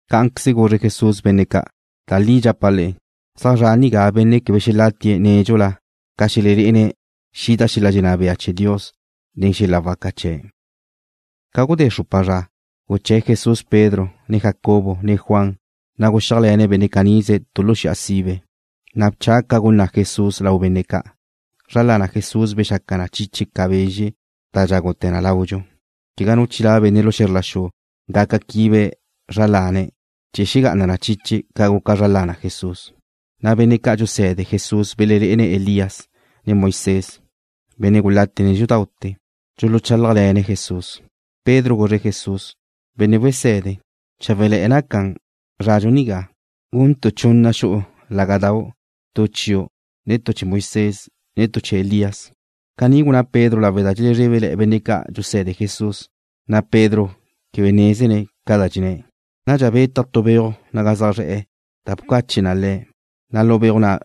Cá'anqueze guzre Jesús benne' ca': ―Da li dxapa' le'e, zaj zra' nigá benne' quebe xelatie̱' nédxula ca xelelé'ene̱' xida xel-la dxenná bea chee̱ Dios nen xel-la waca chee̱'. Ca gudé xrupa zra, guché̱ Jesús Pedro, ne Jacobo, ne Juan, na' guxíajle̱ne̱' benne' canize tu lu xi'a sibe. Na' bcha ca gunná' Jesús lau benne' ca'. Zra lana Jesús bexaca na chiche ca bezxe' da dxágute̱ na laudxu. Quegá nu chilá' benne' lu xe̱zr la xu gaca quibe̱' zra lane̱' chee̱ xegá'ana na chiche ca guca zra lana Jesús. Na' benne' ca' dxuse̱de Jesús belelé'ene̱' Elías, ne Moisés, benne' gulate nédxudaute̱, dxuluchálajle̱ne̱' Jesús. Pedro guzre̱' Jesús: ―Benne' wese̱de, cháwele̱'e̱ naca zradxu nigá. Guntu' chunna xu'u lágadau', tu chiu', ne tu chee̱ Moisés, ne tu chee̱ Elías. Caní gunná Pedro lawe' da dxelezrebe benne' ca' dxuse̱de Jesús, na' Pedro quebe nézene̱' ca da dxenné̱'. Nadxa betaj tu beuj naga zaj zre̱'e̱, da bcache na le̱', na' lu beuj na'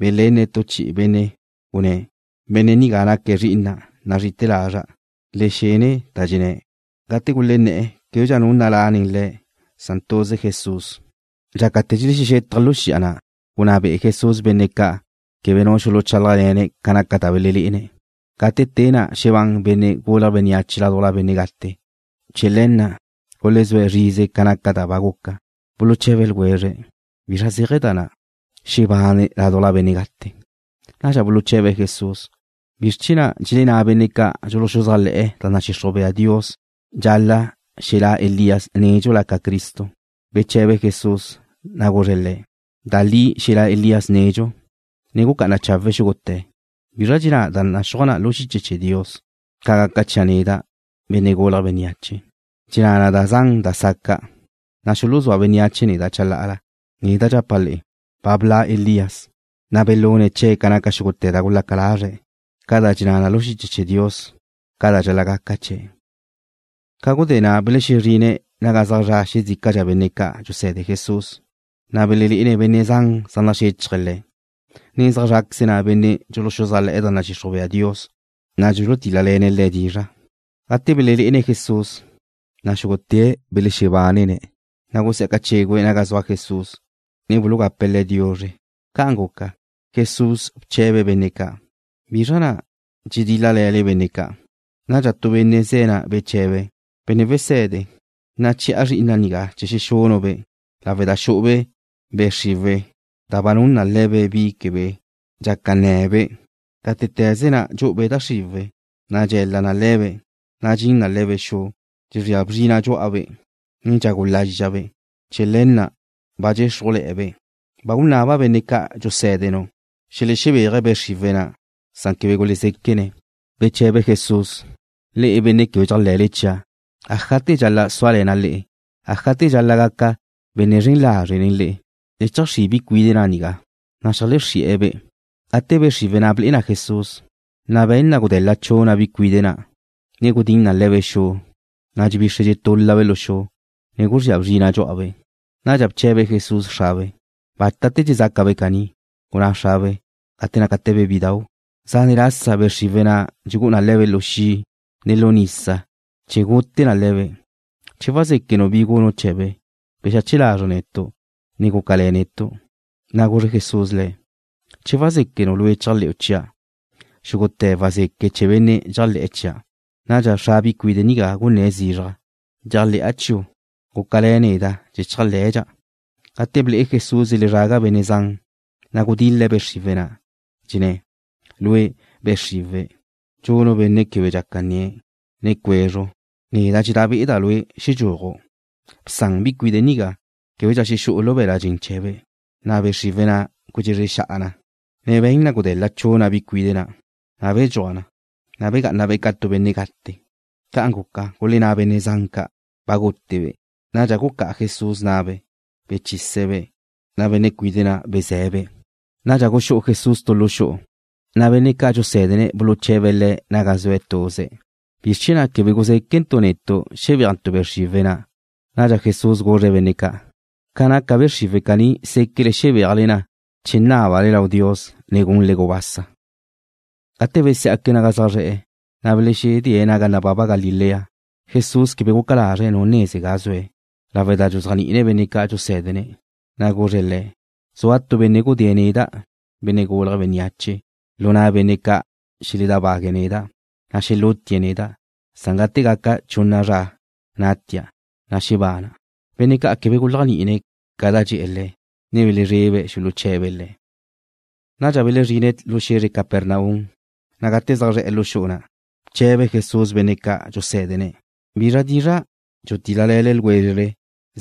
belenne̱' tu chi'i benne', gunné̱': ―Benne' nigá naque̱' Zri'ina' nazrí'ite̱ lazra'. Le xen da dxenné̱'. Gate gulenné̱'e̱, québedxa nu nalá' nen le̱', san tuze Jesús. Dxácate̱ dxelexétaje̱' lu xi'a na', gunná be'e Jesús benne' ca' quebe nu xuluchálajle̱ne̱' ca naca da belelé'ene̱' gate te na' xebán Benne' Gulje̱' Bénneache ládujla benne' gate. Chee̱ le̱ na' gulezúe̱' zrize ca naca da ba guca. Buluche̱be ljwezre̱': ―¿Bizra zéaje̱ da na', xebane̱' ládujla benne' gate? Nadxa buluche̱be̱' Jesús: ―¿Bizr chee̱ na' dxelenná benne' ca' dxuluxuzájle̱'e̱ da nadxixruj bea Dios dxal-la' xelá' Elías nédxula ca Cristo? Beche̱be Jesús, na' guzre̱' le̱': ―Da li xelá' Elías nedxu, ne gucá'ana chawe̱' xúgute̱. ¿Bizra dxenná da naxúaj na lu xiche chee̱ Dios ca gaca chia' neda', Benne' Gulje̱' Bénneache? Dxenná na da zan da saca', na' xuluzúa bénneache neda' chalá'ala. Neda' dxapa' le'e, ba bla' Elías, na' belune̱' chee̱' ca naca xúgute̱ da gulaca lazre̱' ca da dxenná na lu xiche chee̱ Dios ca da dxal-la' gaca chee̱'. Ca gudé na' belexezrine̱' naga zaj zra' xezícadxa benne' ca' dxuse̱de Jesús, na' belelé'ene̱' benne' zan zaj naxéchaje̱' le̱', ne zaj zráqueze na' benne' dxuluxuzájle̱'e̱ da nadxixruj bea Dios, na' dxulutíl-lale̱ne̱' le̱' dizra'. Gate belelé'ene̱' Jesús, na' xúgute̱' belexebánene̱', na' gusí'aca chégüe̱' naga zua Jesús, ne bulugape̱' Le̱' diuzre. Ca'an guca, Jesús bche̱be̱' benne' ca': ―¿Bizra na' dxedíl-lale̱le benne' ca'? Nadxa tu benne' ze̱' ga na' beche̱be̱': ―Benne' wese̱de, nache̱'a zri'ina' nigá chee̱ xexunu'-be' lawe' da xu'ube' be' xriwe̱' da ba nun na le̱be' bi quebe dxaca nne̱be'. Gátete̱ze na' dxu'ube' da xriwe̱', na' dxe̱l-la na le̱be', ne dxin na le̱be' lu xu. Dxezría bzrina' xú'abe', ne dxagu lázxabe'. Chee̱ le̱ na' ba dxéxrujle̱'e̱be'. Ba gunaba' benne' ca' dxusé̱denu' xelexebéaje̱' be' xriwe̱' na', san quebe gulezéquene̱'. Beche̱be Jesús: ―Le'e, benne' quebe dxéajle̱le chia'. ¿Ájate̱ dxal-la' súale̱na' le'e? ¿Ájate̱ dxal-la' gaca' benne' zren lazre' nen le'e? Le cheajxrí' bi cuide' na' nigá. Na' xeajlexrí'e̱-be'. Gate be' xriwe̱' na' ble'e na Jesús, na' be̱n na gudel-la chuna' bi cuide' na', ne gudinna le̱be' xu, na' dxebixre dxetúl-labe' lu xu, ne guzría bzrina' dxú'abe'. Nadxa bche̱be Jesús xrabe': ―¿Bátate̱ dxezácabe' caní? Gunná xrabe': ―Gate nácate̱be' bidau'. Zane' lasa be' xriwe̱' na' dxugú'u na le̱be' lu xi', ne lu nisa chee̱ gute na le̱be'. Che wazéquenu' bi gunu' chee̱be', bexache lazre' netu', ne gúcale̱ netu'. Na' guzre Jesús le̱': ―Che wazéquenu' lue' chéajle̱'u chia', xúgute̱ wazeque chee̱ benne' dxéajle̱'e̱ chia'. Nadxa xra bi cuide' nigá gunné̱' zizraj: ―Dxéajle̱'a chiu'. Gúcale̱ neda' chee̱ chéajle̱dxa'. Gate ble'e Jesús dxelezraga benne' zan, na' gudil-le̱' be' xriwe̱' na', dxenné̱': ―Lue', be' xriwe̱', dxunu' benne' quebe dxaca nnie̱', ne cuezru, neda' dxenná be'eda' lue' xedxúaju'. ¡Bsan bi cuide' nigá! ¡Québedxa xexú'u lu be̱l-la' dxen chee̱be'! Na' be' xriwe̱' na' gudxezre xa'a na, ne be̱n na gudel-la chuna' bi cuide' na', na' bedxúaj na. Na' begá'anabe' ca tu benne' gate. Ca'an guca, gulenná benne' zan ca': ―Ba gútebe'. Nadxa gucá'a Jesús na'be', bechise̱'-be'. Na' benne' cuide' na' beze̱be'. Nadxa guxú'u Jesús tu lu xu'u, na' benne' ca' dxusé̱dene̱' buluche̱be̱' Le̱' naga zue̱' tuze̱': ―¿Bizr chee̱ na' quebe guzéquentu' netu' xebéajntu' be' xriwe̱' na'? Nadxa Jesús guzre̱' benne' ca': ―Ca naca be' xriwe̱' caní séquele xebéajle na che nábale lau Dios, ne gunle gubasa. Gate besí'aque̱' naga zaj zre̱'e̱, na' belexedée̱' naga nababa Galilea. Jesús quebe guca lazre̱' nu neze ga zue̱', lawe' da dxuzéajni'ine̱' benne' ca' dxusé̱dene̱', na' guzre̱' le̱': ―Zua tu benne' gudée̱' neda', Benne' Gulje̱' Bénneache, lu na' benne' ca' dxeledábague̱' neda', na' xelútie̱' neda', san gate gaca chunna zra natia', na' xebana'. Benne' ca' quebe guléajni'ine̱' ca da dxe̱'e̱ le̱', ne belezrebe̱' xuluche̱be̱' Le̱'. Nadxa belezrine̱' lu xe̱zre Capernaum, na' gate zaj zre̱'e̱ lu xu'u na', bche̱be Jesús benne' ca' dxusé̱dene̱': ―¿Bizra dizra' dxutíl-lale̱le ljwézrele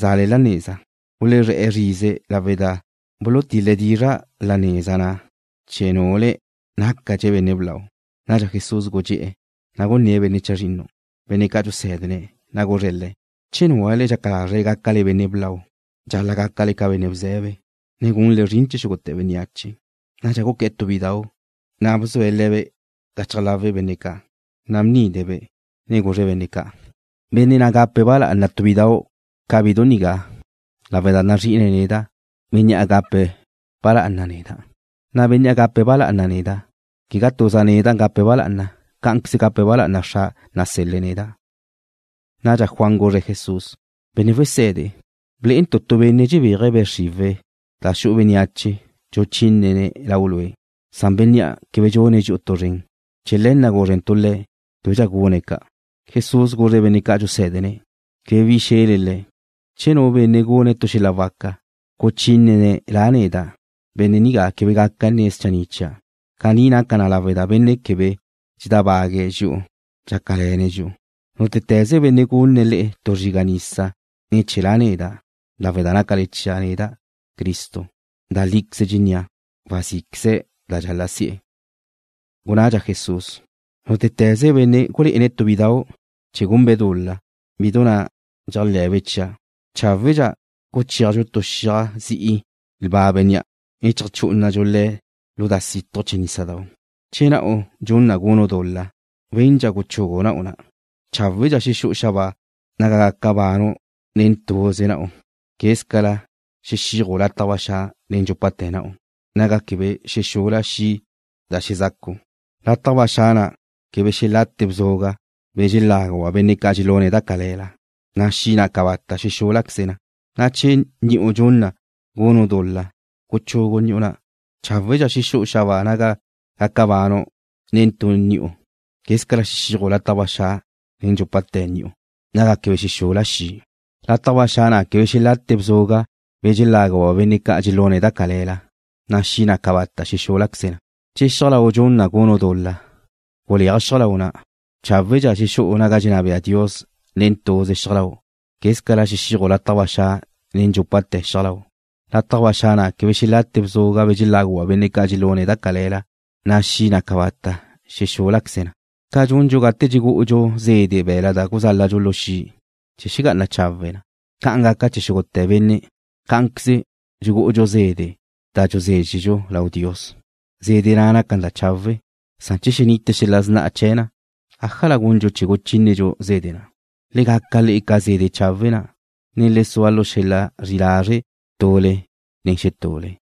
za'le la neza? Gulezré̱'e̱ zrize lawe' da bulutil-le̱' dizra' la neza na' che nule̱' nácadxe̱' benne' blau. Nadxa Jesús gudxé'e̱, na' gunné̱' benne' chazrinnu, benne' ca' dxusé̱dene̱', na' guzre̱' le̱': ―Che núlale dxaca lázrele gácale benne' blau, dxal-la' gácale ca benne' bze̱be, ne gunle zrin chee̱ xúgute̱ bénneache. Nadxa guqué̱'e̱ tu bidau', na' bzue̱' le̱be' gachaj lawe' benne' ca'. Na' bnide̱'-be', ne guzre̱' benne' ca': ―Benne' na' gape̱' ba lá'ana tu bidau' ca bidu nigá lawe' da nazrí'ine̱' neda', bénnea' gape̱' ba lá'ana neda', na' bénnea' gape̱' ba lá'ana neda', quegá tuza' neda' gape̱' ba lá'ana, cá'anqueze gape̱' ba lá'ana Xra' nasel-le̱' neda'. Nadxa Juan guzre̱' Jesús: ―Benne' Wese̱de, blé'entu' tu benne' dxebéaje̱' be' xriwe̱' da xu'u bénneache, dxuchínene̱' Lau' Lue', san bénnea' quebe dxune̱' dxi'u tu zren. Chee̱ le̱ na' gúzrentu' le̱' québedxa gune̱' ca'. Jesús guzre̱' benne' ca' dxusé̱dene̱': ―Quebe bi xe̱le le̱'. Che nu benne' gune̱' tu xel-la waca, guchínene̱' La' neda', benne' nigá quebe gaca nne̱' schanni' chia'. Caní naca na lawe' da benne' quebe dxedábague̱' dxi'u, dxácale̱ne̱' dxi'u. Nútete̱ze benne' gunne̱' le'e tu zriga' nisa ne̱ chee̱ La' neda' lawe' da nácale chia' neda', Cristo, da líqueze dxennía', wazí'queze̱' da dxal-la' si'e̱. Gunnadxa Jesús: ―Nútete̱ze benne' gulé'ene̱' tu bidau' chee̱ gunbe' dul-la, bidu na' dxéajle̱be' chia', cháwedxa guchéajdxu tu xiaj zi'i lba bénnea', ne cheajchú'unadxu le̱' lu da situj chee̱ nísadau'. Che na'u dxun na gunu' dul-la, wendxa guchugu na'u na'. Cháwedxa xexú'u xabáa naga gaca banu' nen tuze na'u quézcala xexíaju' lataj ba xa' nen dxúpate̱ na'u, naga quebe xexula xi' da xezacu'. Lataj ba xa' na' quebe xelate bzuga', be̱ dxeláguba' benne' ca' dxelune̱' da cale̱la, na' xi' na' cabata' xexúl-laqueze na. Na' che ni'u dxun na gunu' dul-la, guchugu ni'u na'. Cháwedxa xexú'u xabáa naga gaca banu' nen tu ni'u, quézcala xexíaju' lataj ba xa' nen dxúpate̱ ni'u, naga quebe xexula xi'. Lataj ba xa' na' quebe xelate bzuga', be̱ dxeláguba' benne' ca' dxelune̱' da cale̱la, na' xi' na' cabata' xexúl-laqueze na. Che xiaj lau' dxun na gunu' dul-la, guleaj xiaj lau' na'. Cháwedxa xexú'u naga dxenná bea Dios nen tuze xiaj lau', quézcala xexíaju' lataj ba xa' nen dxúpate̱ xiaj lau'. Lataj ba xa' na' quebe xelate bzuga', be̱ dxeláguba' benne' ca' dxelune̱' da cale̱la, na' xi' na' cabata' xexúl-laqueze na. ’Ca dxundxu gate dxugú'udxu zede' be̱la' da guzáladxu lu xi' chee̱ xegá'ana chawe' na, ca'an gaca chee̱ xúgute̱ benne'. Cá'anqueze dxugú'udxu zede' da dxuzézxedxu lau Dios. Zede' na' naca na da chawe', san che xenite xel-la sna'a chee̱ na, ¿ájala gundxu chee̱ guchínedxu zede' na'? Le gaca le'e ca zede' chawe' na', ne le sua lu xel-la zri lázre' tule nen xetule.